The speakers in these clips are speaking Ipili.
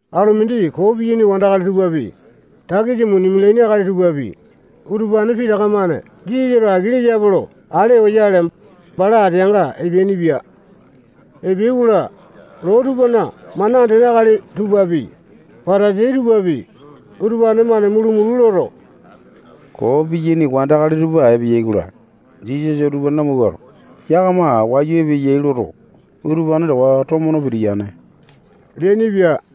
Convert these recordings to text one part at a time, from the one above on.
Alu mindi koo piyaini wandakali tupapi, takisa muni mialaini akali tupapi, utupane pitaka-mane Jisasato aki leyape lo ale oyale, bala ateanga epeainipia. Epeai-kola, loo tupana mana andene akali tupapi, Patasai tupapi, utupane-mane mulu-mulu loto, koo piyaini wandakali tupa epeyai-kola, Jisasato utupane lamawuato, yakama wayu epeyai loto, utupane towa tomo no pitiyane leainipia.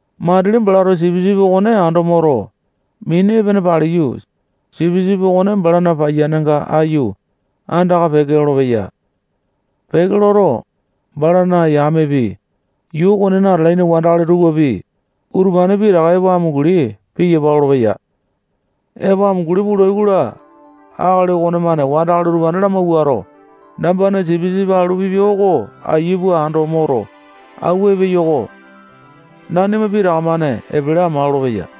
Matili balato sipisipi okone ando moto, mini epene paliyu, sipisipi okone balana paiyanga aiyu, andaka peke lolopeya. Peke loto, balana yamepi, yuu okonena atalaini wandakali tupapi, utupane pitaka epo amunguli piyapa lolopeya. Epo amunguli pulai-kola, akali okonemane wandakali utupane lamawuato, nambana sipisipi alu pipia oko ayia pua ando moto, awua epeyo-ko. Nanima pitaka-mane epele ama lolopeya.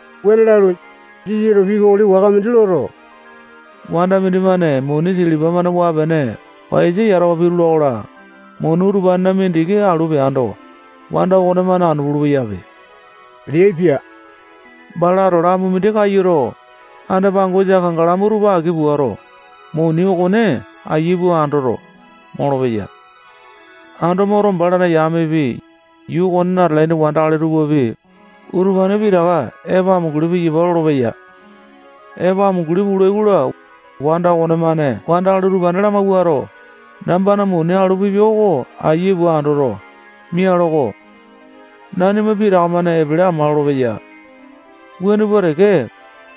Wuane lalu, Jisasato pii kokoli waka mindi loto, wanda mindimane muni silipa-mane waa-pene paiyasa yatawa pitula-kola, muni utupanena mindiki alu peando, wanda okonemane anu pulu-peyape leaipia. Balato lamu mindi kayuto, anda-pangosa kangalamu tupa aki puato, muni okone ayia pua andoto, molopeya. Ando moto, balana yamepi, yuu okonena atalaini wandakali tupapi, utupane pitaka epo amunguli piyapa lolopeya. Epo amunguli pulai-kola, wanda okonemane wandakali utupane lamawuato, nambana muni alu pipia oko ayia pua andoto, mialo-ko. Nanima pitaka-mane epele ama lolopeya. Wuane pua teke,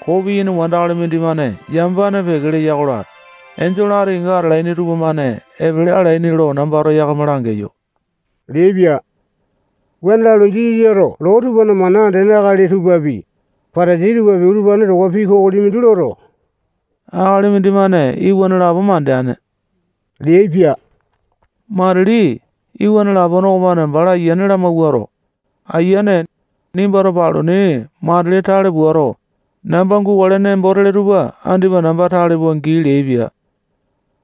koo piyane wandakali mindimane yamapane peke leya-kola, enjole ati kenga atalaini tupamane epele alaini lo nambato yakama langeyo leaipia. Wuane lalu, Jisasato loo tupana mana andene akali tupapi, Patasai tupapi, utupane towa pii kokoli mindi loto, akali mindimane iwana lapo mandeane leaipia. Matili iwana lapone okomane bala ayiane lamawuato, ayiane, nimbato paluni matili tale puato, namba gukale nembo tele tupa andipa namba tale pua gii leaipia.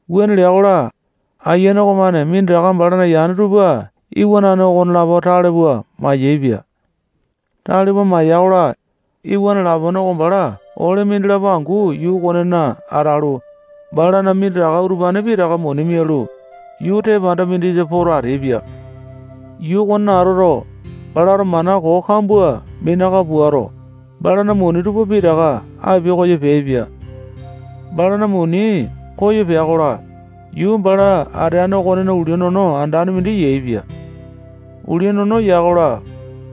Wuane lea-kola, ayiane okomane minditaka balana yane tupa iwanane okonelapo tale pua mayaepia. Tale pua maya-kola, iwana lapone oko bala ole mindilapo angu yuu okonena atalu, balana minditaka utupane pitaka muni mialu, yuu tepanda mindisa poto ateaipia. Yuu okonena atoto, balato mana koo kambua minaka puato, balana muni tupa pitaka apia koyo peaipia. Balana muni koyo pea-kola, yuu bala ateane okonena ulia nono andane mindi yaepia. Ulia nono ya-kola,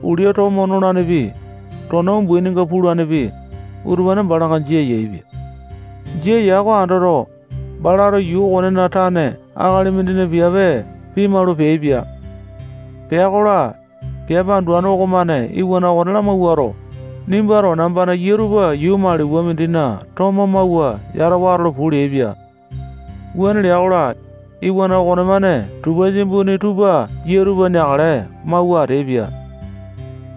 ulia tomo nolanepi, tona umbaininga pulanepi, utupane balanga jia yaepia. Jia ya oko andoto, balato yuu okonena tane akali mindina piape pimalu peaipia. Pea-kola, piape anduane okomane iwana okone lamawuato, nimbato nambana yia tupa yuu maliwa mindina tomo mawua yatawa atolo puu leaipia. Wuane lea-kola, iwana okonemane tupasia imbuni tupa yia tupa neakale mawua ateaipia.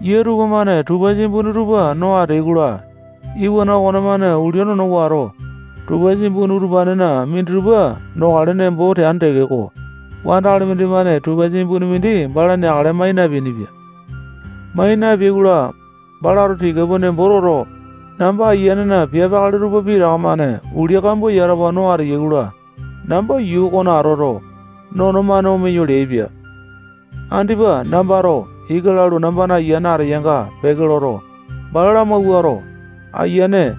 Yia tupamane tupasia imbuni tupa no ateai-kola, iwana okonemane ulia nono wato, tupasia imbuni utupanena minditupa nokale nembo teane tekeko, wandakali mindimane tupasia imbuni mindi bala neakale mai napeainipia. Mai napeai-kola, balato tika pua nembo toto, namba ayianena piape akali tupa pitaka-mane ulia kambua yatawa no ateyai-kola, namba yuu okona atoto, nono-mane omeyo leaipia. Andipa nambato ika lalu, namba ayiane ateyanga peke loto, bala lamawuato, ayiane,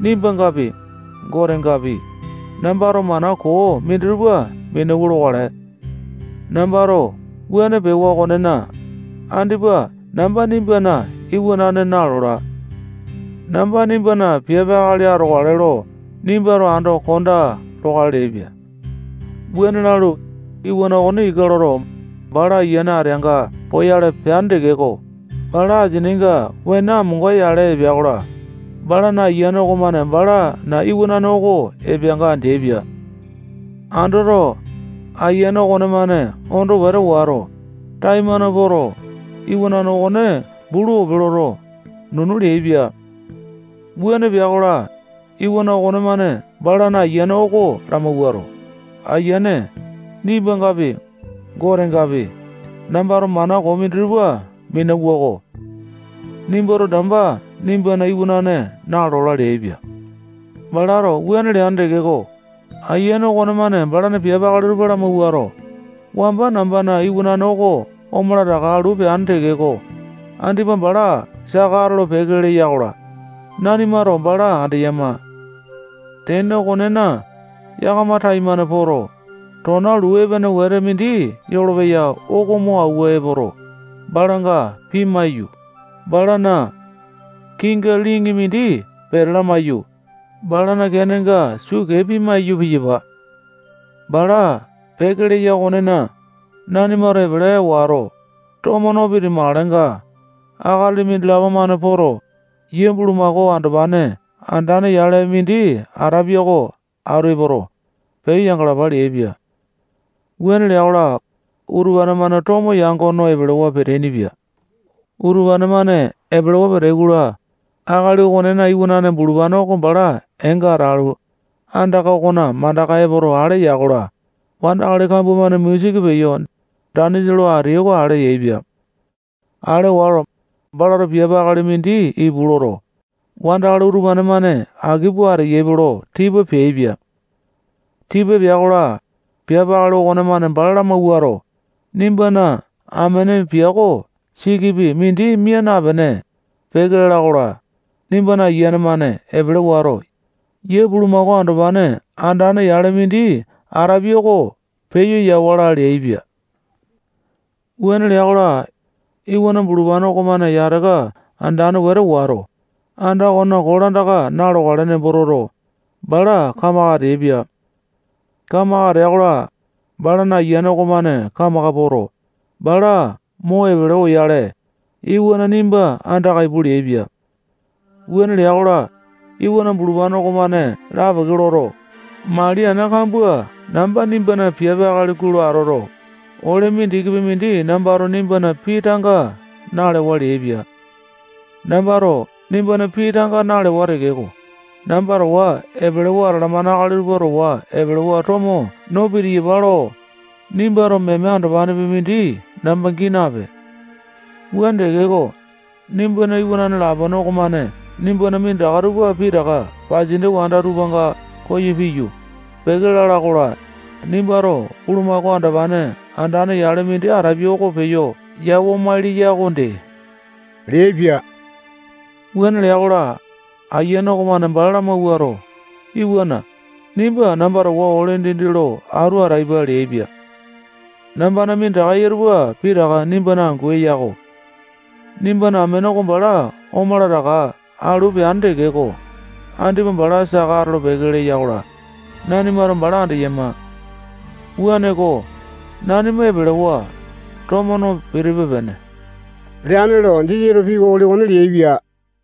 nimbangapi, Gotengapi, nambato mana koo minditupa minauwa lokale. Nambato wuane pewa okonena, andipa namba nimbana iwanane nalola. Namba nimbana piape akali atokale lo nimbato ando kondaa lokale leaipia. Wuane lalu, iwana okone ika loto, bala ayiane ateanga poyale peane tekeko, bala asininga wene amonga-yale epea-kola, balana ayiane okomane balana iwanane oko epeanga andeaipia. Andoto, ayiane okonemane ondo wete wato, taimane poto, iwanane okone bulu ope loto, nunu leaipia. Wuane pea-kola, iwana okonemane balana ayiane oko lamawuato, ayiane, nimbangapi, Gotengapi, nambato mana koo minditupa minauwa-ko. Nimbato namba nimbana iwanane nalola leaipia. Balato wuane leane tekeko, ayiane okonemane balana piape akali tupa lamawuato, wamba nambana iwanane oko omala taka alu peane tekeko, andipa bala saka atolo-peke leya-kola, nanimato bala andeyama. Tene okonena, yakama taimane poto, tona luu epene wete mindi yolopeya oko mo awua epoto, balanga pimaiyu, balana kiinga liŋi mindi pete lamaiyu, balana keenga sukee piya maiyu, piyapa. Bala peke leya okonena, nanimato epele wato, tomo no piti-makalenga, akali mindilapo-mane poto, yia bulumako andopane andane-yale mindi atapia oko atu epoto, peyo yangalapa leaipia. Wuane lea-kola, utupane-mane tomo yango no, epelewa peteaini-pia. Utupane-mane epelewa peteai-kola, akali okonena iwanane bulupane oko bala eenga atalu, anda okona mandaka epoto ale ya-kola, wandakali kambua-mane musiki peyo, danisa lo ateai oko ale yaepia. Ale wato, balato piape akali mindi ipu loto, wandakali utupane-mane aki pua ateyaipe lo tipa peaipia. Tipa pea-kola, piape akali okonemane bala lamawuato, nimbana amene piako sikipi mindi mia napene, peke lala-kola, nimba ayiane-mane epele wato, yia bulumako andopane andane-yale mindi atapia oko peyo yawala leaipia. Wuane lea-kola, iwana bulupane okomane yataka andane wetete wato, anda okonena kolandaka na-lokale nembo toto, bala kamaka ateaipia. Kamaka atea-kola, balana ayiane okomane kamaka poto, bala mo epele oyale, iwana nimba andaka ipu leaipia. Wuane lea-kola, iwana bulupane okomane lapeke loto, mali ana kambua namba nimbana piape akali gulo atoto, ole mindikipi mindi nambato nimbana pii tanga nalewa leaipa. Nambato nimbana pii tanga nalewa tekeko, namba towa epelewa atalamane akali tupa towa epelewa tomo no pitiyapa lo, nimbato meme andopane mindi namba gii napee. Wuane tekeko, nimbana iwanane lapone okomane nimbana minditaka tupa pitaka pasindia wanda tupanga koyo piyu, peke lala-kola, nimbato bulumako andopane andane-yale mindi atapia oko peyo yawa-maili ya okonde leaipia. Wuane lea-kola, ayiane okomane bala lamawuato, iwana, nimba namba towa ole dindi lo atu ataipa leaipia. Nambana minditaka eya tupa pitaka nimbana angu eya-ko. Nimbana amene oko bala omala taka alu peane tekeko, andipa bala saka atolo-peke leya-kola, nanimato bala andeyama. Wuaneko, nanima epelewa, tomo no pitipe-pene leane lo Jisasato pii kokoli okone leaipia.